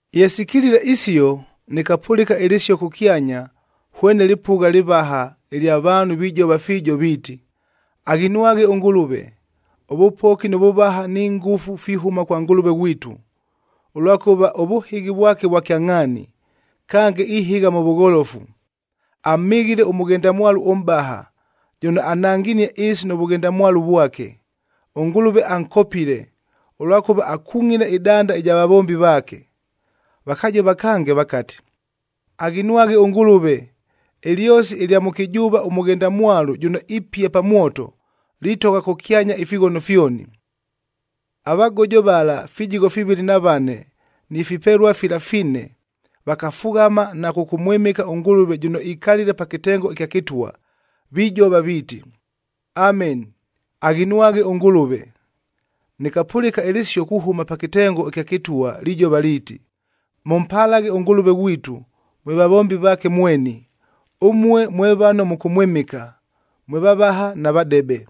Ye sikilile isio, nɨkapʉlɨka ɨlɨsio kʉkyanya hwene lɨpʉgha lɨvaha ɨlya vaanhu vijova fiijo viiti, “Aghinwaghe ʉNgʉlʉve! Ʉvʉpoki nʉ vʉvaha ni ngʉfu fihʉma kwa Ngʉlʉve ghwitu, ʉlwakʉva ʉvʉhɨghi vwake vwa kyangʼhaani, kange ihɨgha mʉ vʉgholofu. Amhɨghile ʉmʉghendamwalu ʉmʼbaha, jʉno ananginie ɨɨsi nʉ vʉghendamwalu vwake. ɄNgʉlʉve ankopile, ʉlwakʉva akungʼile ɨdanda ɨja vavombi vaake.” Vakajova kange vakati, “Aghinwaghe ʉNgʉlʉve! Ɨlyosi ɨlya mʉkɨjʉʉva ʉmʉghendamwalu jʉno ipia pa mwoto, litogha kʉkyanya ifighono fyoni.” Avagojo vala fijigho fivɨlɨ na vane ni fipelua fila fine vakafughama na kʉkʉmwɨmɨka ʉNgʉlʉve jʉno ikalile pa kɨtengo ɨkya kɨtwa, vijova viiti, “Ameni! Aghinwaghe ʉNgʉlʉve!” Nɨkapʉlɨka ɨlɨsio kuhʉma pa kɨtengo ɨkya kɨtwa lijova liiti, “Mʉmpalaghe ʉNgʉlʉve ghwitu, mwe vavombi vaake mweni. Ʉmue mwe vano mʉkʉmwɨmɨka, mwe vavaha na vadebe!”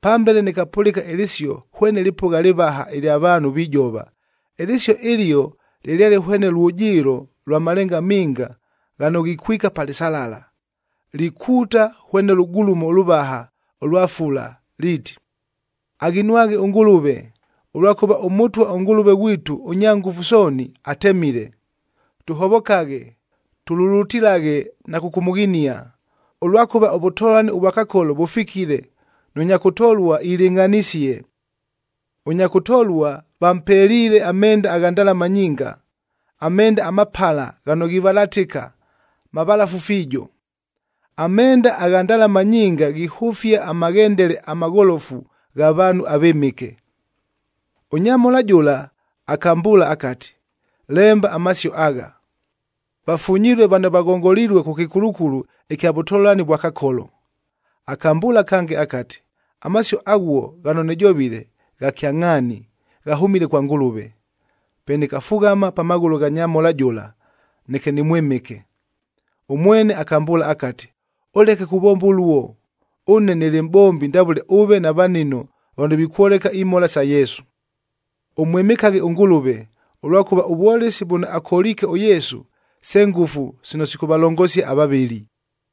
Pambele nɨkapʉlɨka ɨlɨsio hwene lɨpʉgha lɨvaha ɨlya vaanhu vijova. Ɨlɨsio ɨlio lɨlyale hwene lwʉjɨɨlo lwa malenga minga ghano ghikwika pa lɨsalala, likuuta hwene lʉgulumo ʉlʉvaha ʉlwa fula liiti, “Aghinwaghe ʉNgʉlʉve! Ʉlwakʉva ʉMʉtwa ʉNgʉlʉve ghwitu ʉNyangʉfu Sooni, atemile. Tʉhovokaghe, tululutilaghe na kʉkʉmʉghinia, ʉlwakʉva ʉvʉtolani ʉvwa Kakolo vʉfikile, nʉ nya kʉtolua ilɨngʼhanisie. Ʉnya kʉtolua vampeliile amenda agha ndalama nyinga, amenda amapala ghano ghivalatɨka, mavalafu fiijo.” Amenda agha ndalama nyinga ghihʉfia amaghendele amagholofu gha vaanhu avɨmɨke. Ʉnyamhola jʉla akambʉʉla akati, “Lemba amasio agha: Vafunyilue vano vaghongolilue kʉ kɨkulukulu ɨkya vʉtolani vwa Kakolo.” Akambʉʉla kange akati, “Amasio aghuo ghano nɨjovile, gha kyangʼhaani ghahʉmile kwa Ngʉlʉve.” Pe nɨkafughama pa maghʉlʉ gha nyamhola jʉla, neke nɨmwɨmɨke. Ʉmwene akambʉʉla akati, “Ʉleke kuvomba ʉluo, ʉne nɨlɨ mʼbombi ndavʉle ʉve na vanino vano vikwoleka imhola sa Yesu. Ʉmwɨmɨkaghe ʉNgʉlʉve! Ʉlwakʉva ʉvwolesi vʉno akoliike ʉYesu, se ngʉfu sino sikʉvalongosia avavɨli.”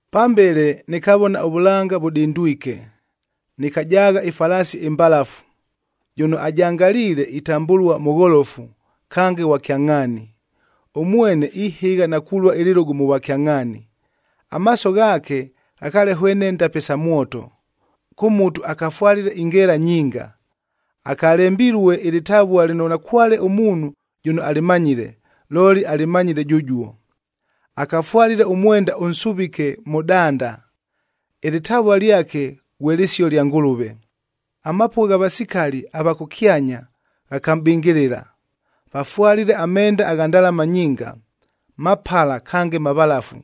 Pambele nɨkavona ʉvʉlanga vʉdindwike. Nɨkajaagha ɨfalaasi ɨmbalafu, jʉno ajangaliile itambʉlua Mʉgholofu, kange Ghwa Kyangʼhaani. Ʉmwene ihɨgha na kulua ɨlɨlʉgʉ mʉ vwakyangʼhaani. Amaaso ghaake ghakaale hwene ndape sa mwoto. Kʉ mutu akafwalile ingeela nyinga. Akalembilue ɨlɨtavua lɨno nakwale ʉmuunhu jʉno alɨmanyile, looli alɨmanyile jʉjuo. Akafwalile ʉmwenda ʉnsʉvike mʉ danda. Ɨlɨtavua lyake ghwe Lɨsio lya Ngʉlʉve. Amapʉgha gha vasikali ava kʉkyanya ghakamʼbɨngɨlɨla, vafwalile amenda agha ndalama nyinga, mapala kange mavalafu.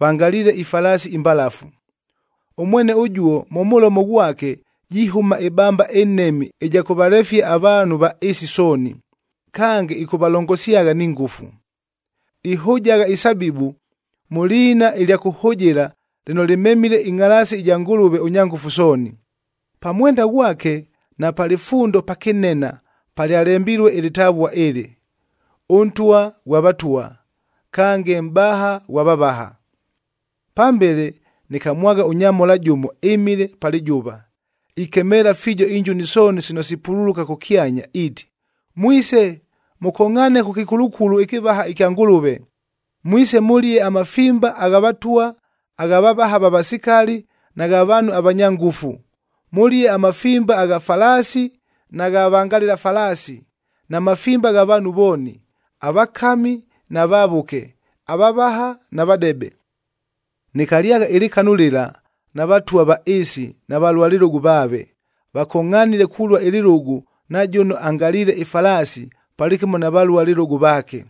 Vangaliile ifalaasi imbalafu. Ʉmwene ʉjuo mʉ mʉlomo ghwake jihʉma ɨbamba ɨnhemi ɨja kʉvalefia avaanhu va ɨɨsi sooni. Kange, ɨkʉvalongosyagha ni ngʉfu. Ihʉjagha isabibu mʉ liina ɨlya kʉhʉjɨla lɨno lɨmemile ɨngʼhalaasi ɨja Ngʉlʉve ʉNyangʉfu Sooni. Pa mwenda ghwake na pa lɨfundo pakɨnena palyalembilue ɨlɨtavua ɨlɨ, ɄNtwa ghwa vatwa, kange Mʼbaha ghwa vavaha. Pambele nɨkamwagha ʉnyamhola jʉmo ɨmile pa lɨjʉva, ikemeela fiijo injuni sooni sino sipululuka kʉkyanya iiti, “Mwise, mʉkongʼhaane kʉ kɨkulukulu ɨkɨvaha ɨkya Ngʉlʉve. Mwise mʉlie amafimba gha vatwa, agha vavaha va vasikali, na gha vaanhu avanya ngʉfu. Mʉlie amafimba gha falaasi na gha vangalɨla falaasi, na mafimba gha vaanhu vooni: avakami na vavʉke, avavaha na vadebe.” Nɨkalyagha ɨlɨkanu lɨla na vatwa va ɨɨsi na valua lɨlʉgʉ vaave, vakongʼhanile kulua ɨlɨlʉgʉ na jʉno angaliile ɨfalaasi palɨkɨmo na valua lɨlʉgʉ vaake.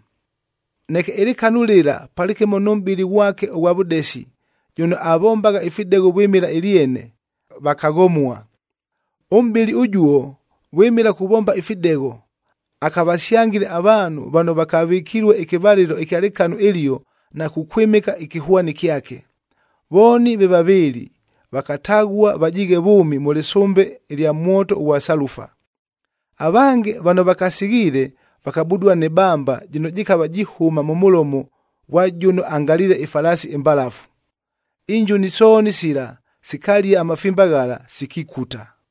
Neke ɨlɨkanu lɨla palɨkɨmo nʉ mʼbɨli ghwake ʉghwa vʉdesi jʉno avombagha ifidegho vwɨmɨla ɨlyene, vakaghomua. Ʉmʼbɨli ʉjuo vwɨmɨla kuvomba ifidegho, akavasyangile avaanhu vano vakavɨkilue ɨkɨvalɨlo ɨkya lɨkanu ɨlio na kukwɨmɨka ɨkɨhwani kyake. Vooni ve vavɨɨlɨ vakataghua vajiighe vʉʉmi mʉ lɨsʉmbe ɨlya mwoto ʉghwa salufa. Avange vano vakasighiile vakabudua nɨ bamba jɨno jɨkava jihʉma mʉ mʉlomo ghwa jʉno angaliile ɨfalaasi ɨmbalafu. Injuni sooni sila sikalia amafimba ghala, sikikuta.